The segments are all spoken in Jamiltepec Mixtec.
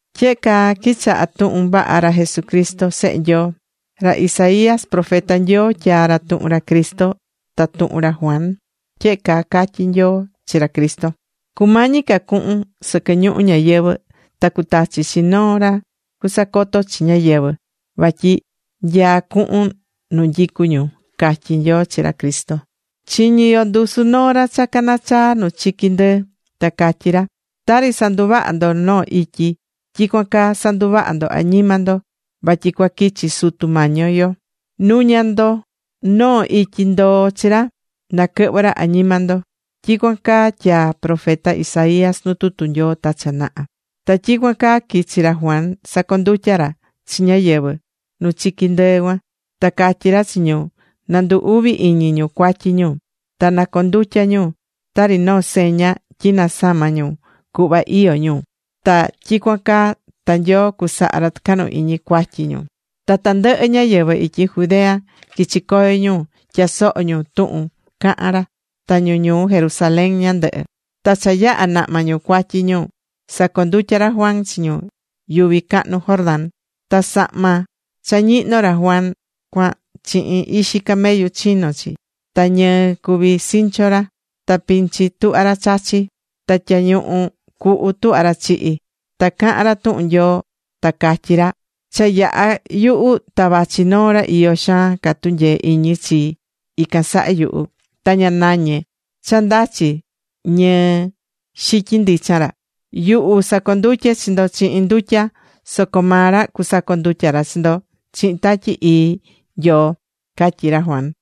Tyehe caa quichaha̱ tuhun vaha ra Jesuscristo Sehe Nyoo. Ra Isaías profeta Nyoo tyaa̱ ra tuhun ra Cristo ta tuhun ra Juan. Tyehe caa catyí Nyoo chi ra Cristo: Cumañi ca cuhun sɨquɨ ñuhu ñayɨvɨ̱ ta cutachi chi noo ra cusacoto chi ñáyɨvɨ vatyi nyaá cuhun nu nyicú ñu, catyí Nyoo chi ra Cristo. Chiñí yo ndusu noo ra cha canachaá nu chiqui ndɨɨ, ta catyí ra: “Tari sanduvahá ndo noo ityi, tyicuan caa sa̱nduvaha ndo añima ndo vatyi cua quichi Sutu Mañi yo. Nu̱ña ndo noo ityi ndoo chi ra na quɨhvɨ ra añima ndo.” Tyicuan caa tyaa̱ ra profeta Isaías nu tutu Nyoo ta cha naha. Ta tyicuan caa quichi̱ ra Juan sacondutya̱ ra chi ñáyɨvɨ nu chiqui ndɨɨ cuan. Ta catyí ra chi ñu na ndu uvi iñi ñu cuatyi ñu, ta na condutya ñu tari noo seña tyi nasama̱ ñu cuhva iyó ñu, ta tyicuan caa ta Nyoo cusaha ra tɨcahnu iñi cuatyi ñu. Ta tandɨhɨ ñáyɨvɨ ityi Judea quichi̱ coyo ñu tyasoho ñu tuhun cahán ra, ta ñu ñuu Jerusalén ñandɨhɨ. Ta cha yaha̱ nahma ñu cuatyi ñu, sacondutya̱ ra Juan chi ñu yuvi cahnu Jordán. Ta sahma cha ñihno ra Juan cuan chihin ixi camellu chino̱ chi. Ta ñɨɨ cuví sinchu ra. Ta pinchi tuhvá ra chachí. Ta tyañuñu cuhu tuhvá ra chihí. Ta cahán ra tuhun Nyoo ta catyí ra: ―Cha yaha yuhu ta vachi noo ra iyó xaan ca tunyee iñi chi ican saha yuhu. Ta ña nañé ni cha ndachi ñɨɨ xityin ndichan ra. Yuhu sacondutyé chi ndo chihin ndutya. Soco maa ra cusacondutya ra chi ndo chihin Tatyi Ii Nyoo ―catyí ra Juan.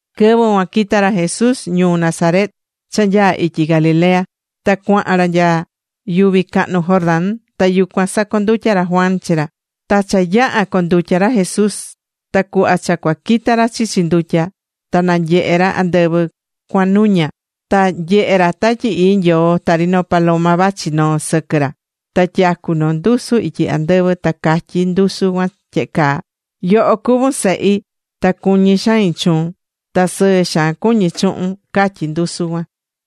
Quɨvɨ cuan quita̱ ra Jesús ñuu Nazaret, cha nyaá ityi Galilea, ta cuahan ra nya yuvi cahnu Jordán. Ta yucuan sacondutya̱ ra Juan chi ra. Ta cha yaha̱ condutya ra Jesús, ta cuhva cha cua quita ra chichi ndutya, ta nanyehe̱ ra andɨvɨ cuahan nuña. Ta nyehe̱ ra Tatyi Ii Nyoo tari noo paloma, vachi noó sɨquɨ ra. Ta tyacú noo ndusu ityi andɨvɨ ta catyí ndusu cuan tyehe caa: ―Yoho cuvún Sehi ta cuñí xain chuun. Ta sɨɨ xaan cuñí chuhun ―catyí ndusu cuan.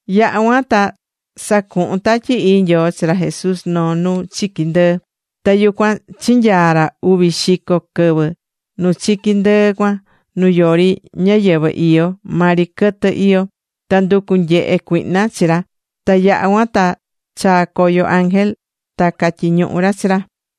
Yaha̱ cuan ta sacuhu̱n Tatyi Ii Nyoo chi ra Jesús noo nu chiqui ndɨɨ. Ta yucuan chinyaa̱ ra uvi xico quɨvɨ nu chiqui ndɨɨ cuan, nu yori ñáyɨvɨ iyó, maa ri quɨtɨ iyó. Ta nducu̱ nyehe cuihna chi ra. Ta yaha̱ cuan ta chaa̱ coyo ángel ta catyiñuhu̱ ra chi ra.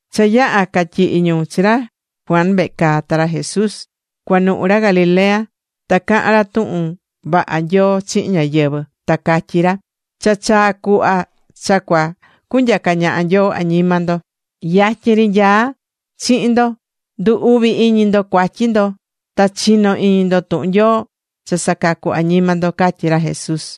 Cha yaha̱ catyihi̱ ñu chi ra Juan vehe caa, ta ra Jesús cuanuhu ra Galilea ta cahán ra tuhun vaha Nyoo chihin ñáyɨvɨ. Ta catyí ra: ―Cha chaa̱ cuhva cha cua cunyaca ñaha Nyoo añima ndo. Yatyin ri nyaá ra chihin ndo. Ndu̱ uvi iñi ndo cuatyi ndo, ta chi̱no iñi ndo tuhun Nyoo cha sacacu añima ndo ―catyí ra Jesús.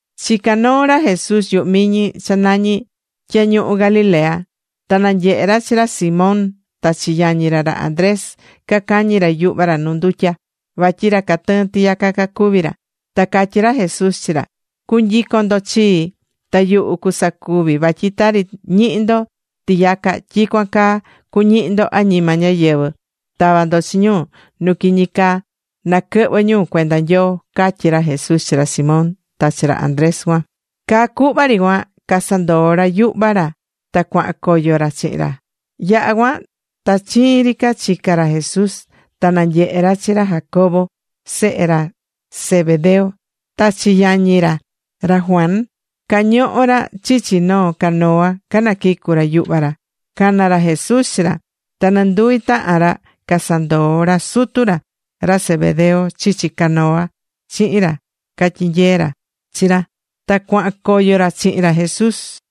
Chicá noo ra Jesús yuhu miñi cha nañí Tyañuhu Galilea. Ta nanyehe̱ ra chi ra Simón ta chi yañi ra, ra Andrés, cacañí ra yuhva ra nu ndutya, vatyi ra catɨɨ́n tiyaca cacuví ra. Ta catyí ra Jesús chi ra: ―Cu̱nyicon ndo chii, ta yuhu cusacuvi vatyi tari ñihí ndo tiyaca, tyicuan caa cuñihi ndo añima ñáyɨvɨ, tava ndo chi ñu nu quiñi caa, na quɨhvɨ ñu cuenda Nyoo ―catyí ra Jesús chi ra Simón ta chi ra Andrés cuan. Caa cuhva ri cuan casandoo̱ ra yuhva ra, ta cuahan coyo ra chihin ra. Yaha̱ cuan ta chiin ri ca chica̱ ra Jesús, ta nanyehe̱ ra chi ra Jacobo, sehe ra Zebedeo, ta chi yañi ra, ra Juan. Cañohó ra chichi noo canoa canaquicú ra yuhva ra. Cana̱ ra Jesús chi ra. Ta nɨnduvi tahan ra casandoo̱ ra sutu ra, ra Zebedeo, chichi canoa chihin ra catyinyeé chi ra. Ta cuahan coyo ra chihin ra Jesús.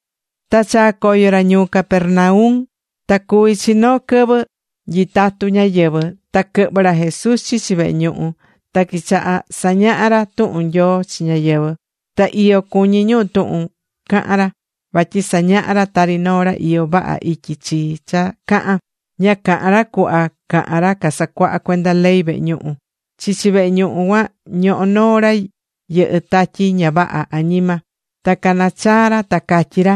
Ta chaa̱ coyo ra ñuu Capernaum. Ta cuví chi noo quɨvɨ nyitatú ñáyɨvɨ, ta quɨhvɨ̱ ra Jesús chichi vehe ñuhu, ta quichaha̱ sañaha ra tuhun Nyoo chi ñáyɨvɨ. Ta iyo cuñí ñu tuhun cahán ra, vatyi sañahá ra tari noo ra iyó vaha ityi chii cha cahán. Ña cahán ra cuhva cahán ra casacuahá cuenda ley vehe ñuhu. Chichi vehe ñuhu cuan ñohó noo ra yɨhɨ́ tatyi ña vaha añima. Ta cana̱ chaa ra ta catyí ra: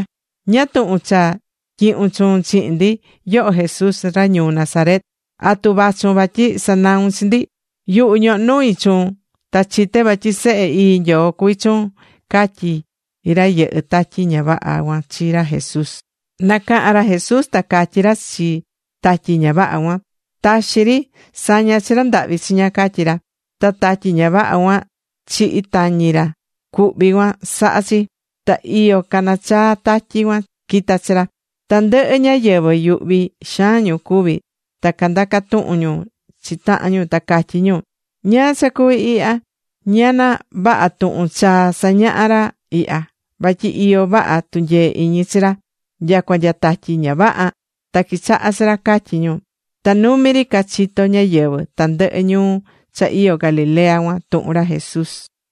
―¿Ñáá tuhun cha tyihún chuun chihin ndi, yoho Jesús ra ñuu Nazaret? ¿Atu vachun vatyi sanaun chi ndi? Yuhu ñohó nui chuun, ta chité vatyi Sehe Ii Nyoo cuví chuun ―catyí ra yɨhɨ́ tatyi ña vaha cuan chi ra Jesús. Nacaha̱n ra Jesús ta catyí ra chi tatyi ña vaha cuan: ―¡Taxi ri! ¡Sa̱ña chi ra ndahvi chiña! ―catyí ra. Ta tatyi ña vaha cuan, chihi̱ tañi ra cuhví cuan saha̱ chi, ta iyo canachaa̱ tatyi cuan quita̱ chi ra. Tandɨhɨ ñáyɨvɨ yuhvi xaan ñu cuvi̱, ta candaca̱ tuhun ñu chi tahan ñu, ta catyí ñu: ―¿Ñáá cha cuví ihya? ¿Ñana vaha tuhun chaa sañahá ra ihya? ¡Vatyi iyo vaha tunyee iñi chi ra, nyacua nya tatyi ña vaha, ta quichahá chi ra! ―catyí ñu. Ta numi ri cachito̱ ñáyɨvɨ tandɨhɨ ñuu cha iyó Galilea cuan tuhun ra Jesús.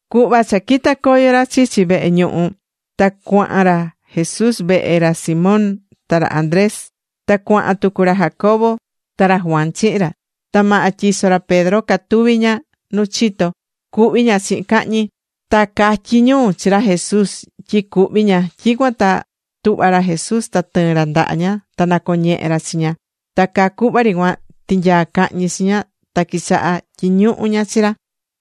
Cuhva cha quita̱ coyo ra chichi vehe ñuhu, ta cuahan ra Jesús vehe ra Simón ta ra Andrés. Ta cuahan tucu ra Jacobo ta ra Juan chihin ra. Ta maha tyiso ra Simón catuví ña nu chito, cuhví ña chihin cahñi. Ta catyi̱ ñu chi ra Jesús tyi cuhví ña. Tyicuan ta tuhva̱ ra Jesús, ta tɨɨ̱n ra ndaha ña. Ta nacoñehe̱ ra chi ña. Ta caa cuhva ri cuan, tinyaa̱ cahñi chi ña. Ta quichaha tyiñuhu ña chi ra.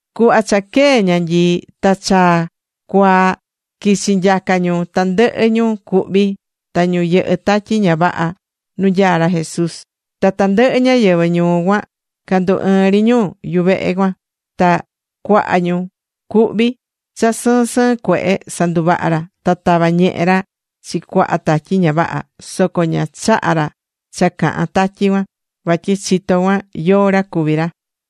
Cuhva cha quee̱ ñanyii ta cha cua cuaa, quichi̱ nyaca ñu tandɨhɨ ñu cuhví ta ñu yɨhɨ́ tatyi ña vaha nu nyaá ra Jesús. Ta tandɨhɨ ñáyɨvɨ ñuu cuan candu ɨɨ̱n ri ñu yuvehe cuan. Ta cuaha ñu cuhví cha sɨɨn sɨɨn cuehe sanduvaha̱ ra. Ta tava̱ ñehe ra chi cuaha tatyi ña vaha, soco ña chaha̱ ra cha cahan tatyi cuan, vatyi chitó cuan yóó ra cuví ra.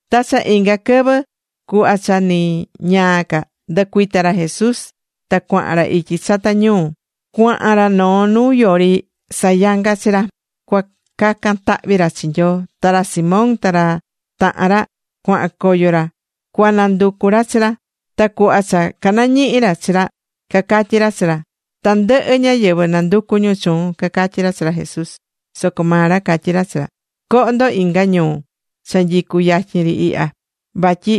Ta cha inga quɨvɨ cuhva cha ni ñaa ca, ndɨcuita̱ ra Jesús, ta cuahan ra ityi chata ñuu. Cuahan ra noo nu yori sayanga chi ra cua cacan tahvi ra chi Nyoo. Ta ra Simón ta ra tahan ra cuahan coyo ra cua nanducu ra chi ra. Ta cuhva cha canañihi̱ ra chi ra cacatyí ra chi ra: ―Tandɨhɨ ñáyɨvɨ nanducú ñu chuun ―cacatyí ra chi ra Jesús. Soco maa ra catyí ra chi ra: ―Co̱ho ndo inga ñuu cha nyicú yatyin ri ihya, vatyi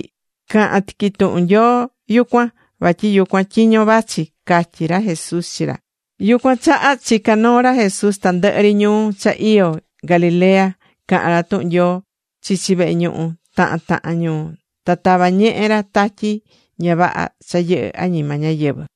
cahan tiqui tuhun Nyoo yucuan, vatyi yucuan tyiño vachi ―catyí ra Jesús chi ra. Yucuan chaha chica̱ noo ra Jesús tandɨhɨ ri ñuu cha iyó Galilea, cahán ra tuhun Nyoo chichi vehe ñuhu tahan tahan ñuu. Ta tava̱ ñehe ra tatyi ña vaha cha yɨhɨ̱ añima ñáyɨvɨ.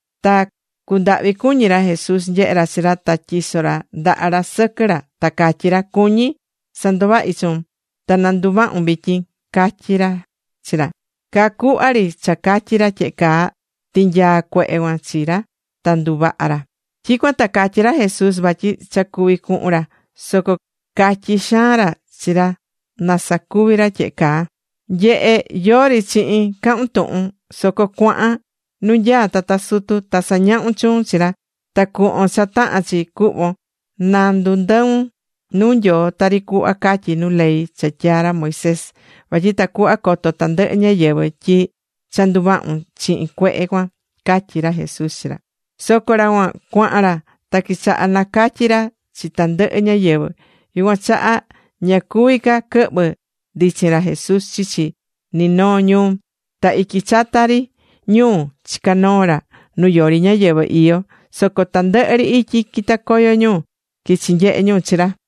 Ta cundahvi cuñí ra Jesús nyehé ra chi ra, ta tyiso̱ ra ndaha ra sɨquɨ ra, ta catyí ra: ―Cuñí sanduvahi chuun. Ta na nduvahun vityin ri ―catyí ra chi ra. Caa cuhva ri cha catyi̱ ra tyehe caa, tinyaa̱ cuehe cuan chi ra, ta nduvaha̱ ra. Tyicuan ta catyí ra Jesús vatyi cha cuvi cuhun ra, soco catyi̱ xaan ra chi ra na sacuvi ra tyehe caa: ―Nye̱he. Yori chihin cahun tuhun. Soco cua̱han nu nyaá tata sutu. Ta sa̱ñahun chuun chi ra, ta cu̱hvon cha tahán chi cuhvon na ndundɨun nu Nyoo tari cuhva catyí nu ley cha tyaa̱ ra Moisés, vatyi tacuhva coto tandɨhɨ ñáyɨvɨ tyi cha nduvahu̱n chihin cuehe cuan ―catyí ra Jesús chi ra. Soco ra cuan chaha̱n ra, ta quichaha̱ nacatyi ra chi tandɨhɨ ñáyɨvɨ. Yucuan chaha ña cuvi̱ ca quɨhvɨ ndichin ra Jesús chichi ni noo ñuu. Ta ityi chata ri ñuu chicá noo ra nu yori ñáyɨvɨ iyó, soco tandɨhɨ ri ityi quita̱ coyo ñu, quichi̱ nyehe ñu chi ra.